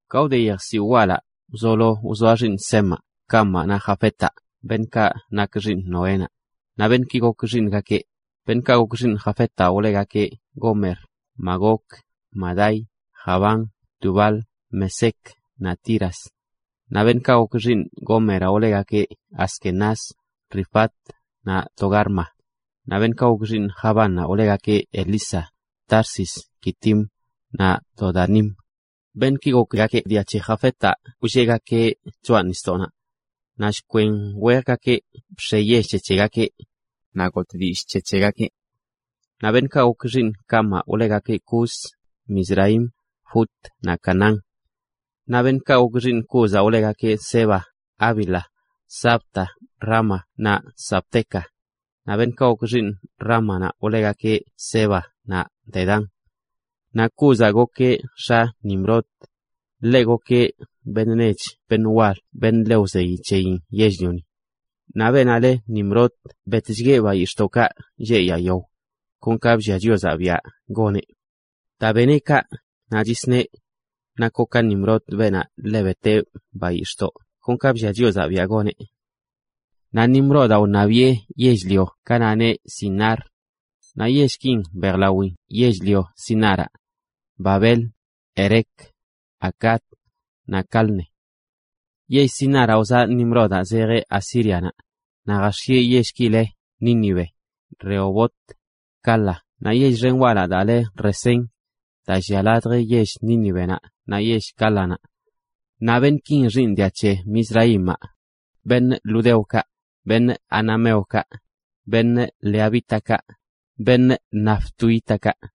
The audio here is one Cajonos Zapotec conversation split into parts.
Ka wde yejsiwꞌ walaꞌ, wzolo wzoa xiiṉ Semaꞌ, Camaꞌ naꞌ Jafetaꞌ, beṉꞌkaꞌ nak xiiṉ Noénaꞌ. Naꞌ beṉꞌki gok xiiṉgakeꞌ: beṉꞌkaꞌ gok xiiṉ Jafetaꞌ wlegakeꞌ Gomer, Magog, Madai, Javán, Tubal, Mesec, naꞌ Tiras. Naꞌ beṉꞌkaꞌ gok xiiṉ Gomeraꞌ wlegakeꞌ Askenaz, Rifat, naꞌ Togarma. Naꞌ beṉꞌkaꞌ gok xiiṉ Javánnaꞌ wlegakeꞌ Elisa, Tarsis, Quitim, naꞌ Dodanim. Beṉꞌki gokgakeꞌ dia c̱he Jafetaꞌ wlleꞌgakeꞌ choꞌa nisdoꞌnaꞌ. Naꞌ shkwen wejgakeꞌ bx̱e yell c̱he c̱hegakeꞌ, naꞌ gotꞌ dillꞌ c̱he c̱hegakeꞌ. Naꞌ beṉꞌkaꞌ gok xiiṉ Camaꞌ wlegakeꞌ Cus, Misraim, Fut naꞌ Canaán. Naꞌ beṉꞌkaꞌ gok xiiṉ Cúzaꞌ wlegakeꞌ Seba, Havila, Sabta, Raama naꞌ Sabteca. Naꞌ beṉꞌkaꞌ gok xiiṉ Raámanaꞌ wlegakeꞌ Seba naꞌ Dedán. Naꞌ Cúzaꞌ gokeꞌ x̱a Nimrod, ḻeꞌ gokeꞌ beṉꞌ nech beṉꞌ wal beṉꞌ ḻe wzeyi c̱heyin yell-lioni. Naꞌ beenaꞌ le Nimrod betchgueꞌ bayix̱ꞌdoꞌkaꞌ lleꞌ yaa yao, kon ka bllia Chiozaꞌ biaꞌ goneꞌ. Daa beneꞌ kaꞌ, naꞌ nagakeꞌ: “Nakoꞌ ka Nimrod, beenaꞌ ḻe beteꞌ bayix̱ꞌdoꞌ kon ka bllia Chiozaꞌ biaꞌ goneꞌ.” Naꞌ Nimrodaꞌ wṉabiꞌe yell-lio ganaꞌ le Sinar, naꞌ yellki mbejlawin yell-lio Sinaraꞌ: Babel, Erec, Acad, naꞌ Calne. Yell Sinaraꞌ wzaꞌ Nimrodaꞌ zejeꞌ Asírianaꞌ, naꞌ jax̱ieꞌ yellki le Nínive, Rehobot, Cala, naꞌ yell xen walaꞌ daa le Resén, daa llia ladj yell Nínivenaꞌ naꞌ yell Cálanaꞌ. Naꞌ beṉꞌki xiiṉ dia c̱he Misraimaꞌ: ludeokaꞌ, anameokaꞌ, lehabítakaꞌ, naftuhítakaꞌ,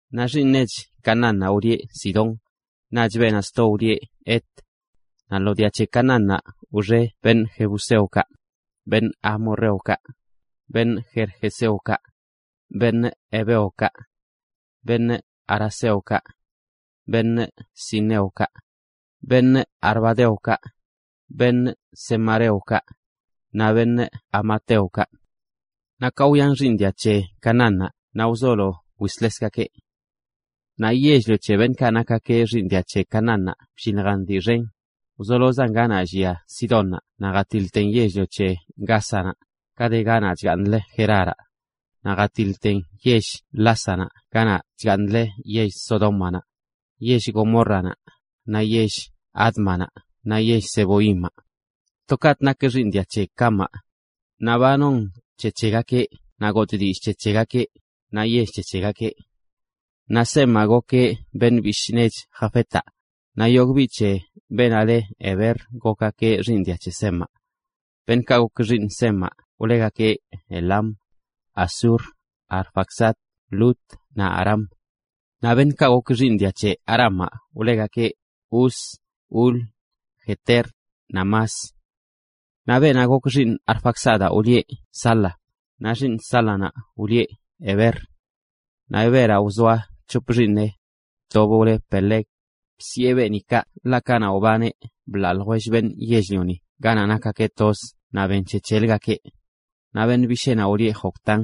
Naꞌ xiiṉ nech Canaánnaꞌ wlieꞌ Sidón, naꞌch beenaꞌ sto wlieꞌ Het. Naꞌ lo dia c̱he Canaánnaꞌ wxe jebuseokaꞌ, amorreokaꞌ, gergeseokaꞌ, heveokaꞌ, araceokaꞌ, sineokaꞌ, arvadeokaꞌ, zemareokaꞌ, naꞌ hamateokaꞌ. Naꞌ ka wyan xiiṉ dia c̱he Canaánnaꞌ naꞌ wzolo wislesgakeꞌ. Naꞌ yell-lio c̱he beṉꞌkaꞌ nak xiiṉ dia c̱he Canaánnaꞌ blliljan dii xen, wzolozan ganaꞌ llia Sidónnaꞌ naꞌ jatiḻten yell-lio c̱he Gázanaꞌ, ka de ganaꞌ chgaaṉlə Geraraꞌ, naꞌ jatiḻten yell Lásanaꞌ ganaꞌ chgaaṉlə yell Sodómanaꞌ, yell Gomórranaꞌ, naꞌ yell Ádmanaꞌ naꞌ yell Zeboimaꞌ. To kaꞌtꞌ nak xiiṉ dia c̱he Camaꞌ, naꞌ ba non c̱he c̱hegakeꞌ naꞌ gotꞌ dillꞌ c̱he c̱hegakeꞌ, naꞌ yell c̱he c̱hegakeꞌ. Naꞌ Semaꞌ, gokeꞌ beṉꞌ bishꞌ nech Jafetaꞌ, naꞌ yogꞌ biꞌ c̱he beenaꞌ le Heber gokgakeꞌ xiiṉ dia c̱he Semaꞌ. Beṉꞌkaꞌ gok xiiṉ Semaꞌ wlegakeꞌ Elam, Asur, Arfaxad, Lud, naꞌ Aram. Naꞌ beṉꞌkaꞌ gok xiiṉ Aramaꞌ wlegakeꞌ Uz, Hul, Geter, naꞌ Mas. Naꞌ beenaꞌ gok xiiṉ Arfaxadaꞌ wlieꞌ Sala, naꞌ xiiṉ Sálanaꞌ wlieꞌ Heber. Naꞌ Heberaꞌ wzoa c̱hop xiiṉeꞌ: tobꞌ wle Peleg, bsiꞌe beeni kaꞌ ḻaꞌ kanaꞌ wbaneꞌ blaa ljwell beṉꞌ yell-lioni ganaꞌ nakgakeꞌ toz naꞌ ben c̱he c̱heləgakeꞌ. Naꞌ beṉꞌ bisheenaꞌ wlieꞌ Joctán.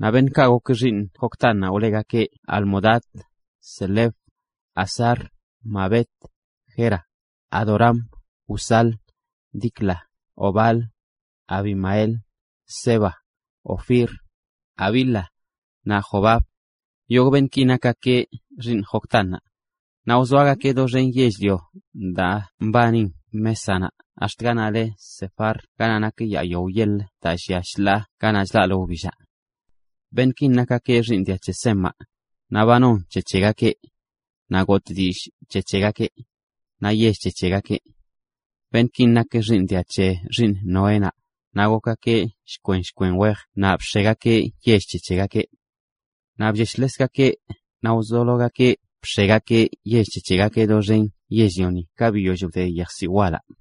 Naꞌ beṉꞌkaꞌ gok xiiṉ Joctánnaꞌ wlegakeꞌ Almodad, Selef, Hazar-mavet, Jera, Adoram, Uzal, Dicla, Obal, Abimael, Seba, Ofir, Havila, naꞌ Jobab. Yogꞌ beṉꞌki nakgakeꞌ xiiṉ Joctánnaꞌ. Naꞌ wzoagakeꞌ doxen yell-lio daa mbanin Mésanaꞌ ax̱t ganaꞌ le Sefar ganaꞌ nak yaa yao yeḻə daa llia shḻaa ganaꞌ chlaꞌlə wbillaꞌ. Beṉꞌkin nakgakeꞌ xiiṉ dia c̱he Semaꞌ, naꞌ ba non c̱he c̱hegakeꞌ, naꞌ gotꞌ dillꞌ c̱he c̱hegakeꞌ, naꞌ yell c̱he c̱hegakeꞌ. Beṉꞌki nak xiiṉ dia c̱he xiiṉ Noénaꞌ, naꞌ gokgakeꞌ shkwen shkwen wejə naꞌ bx̱egakeꞌ yell c̱he c̱hegakeꞌ. Naꞌ blleshlesgakeꞌ naꞌ wzologakeꞌ bx̱egakeꞌ yell c̱he c̱hegakeꞌ doxen yell-lioni ka biyoll wde yejsiwꞌ walaꞌ.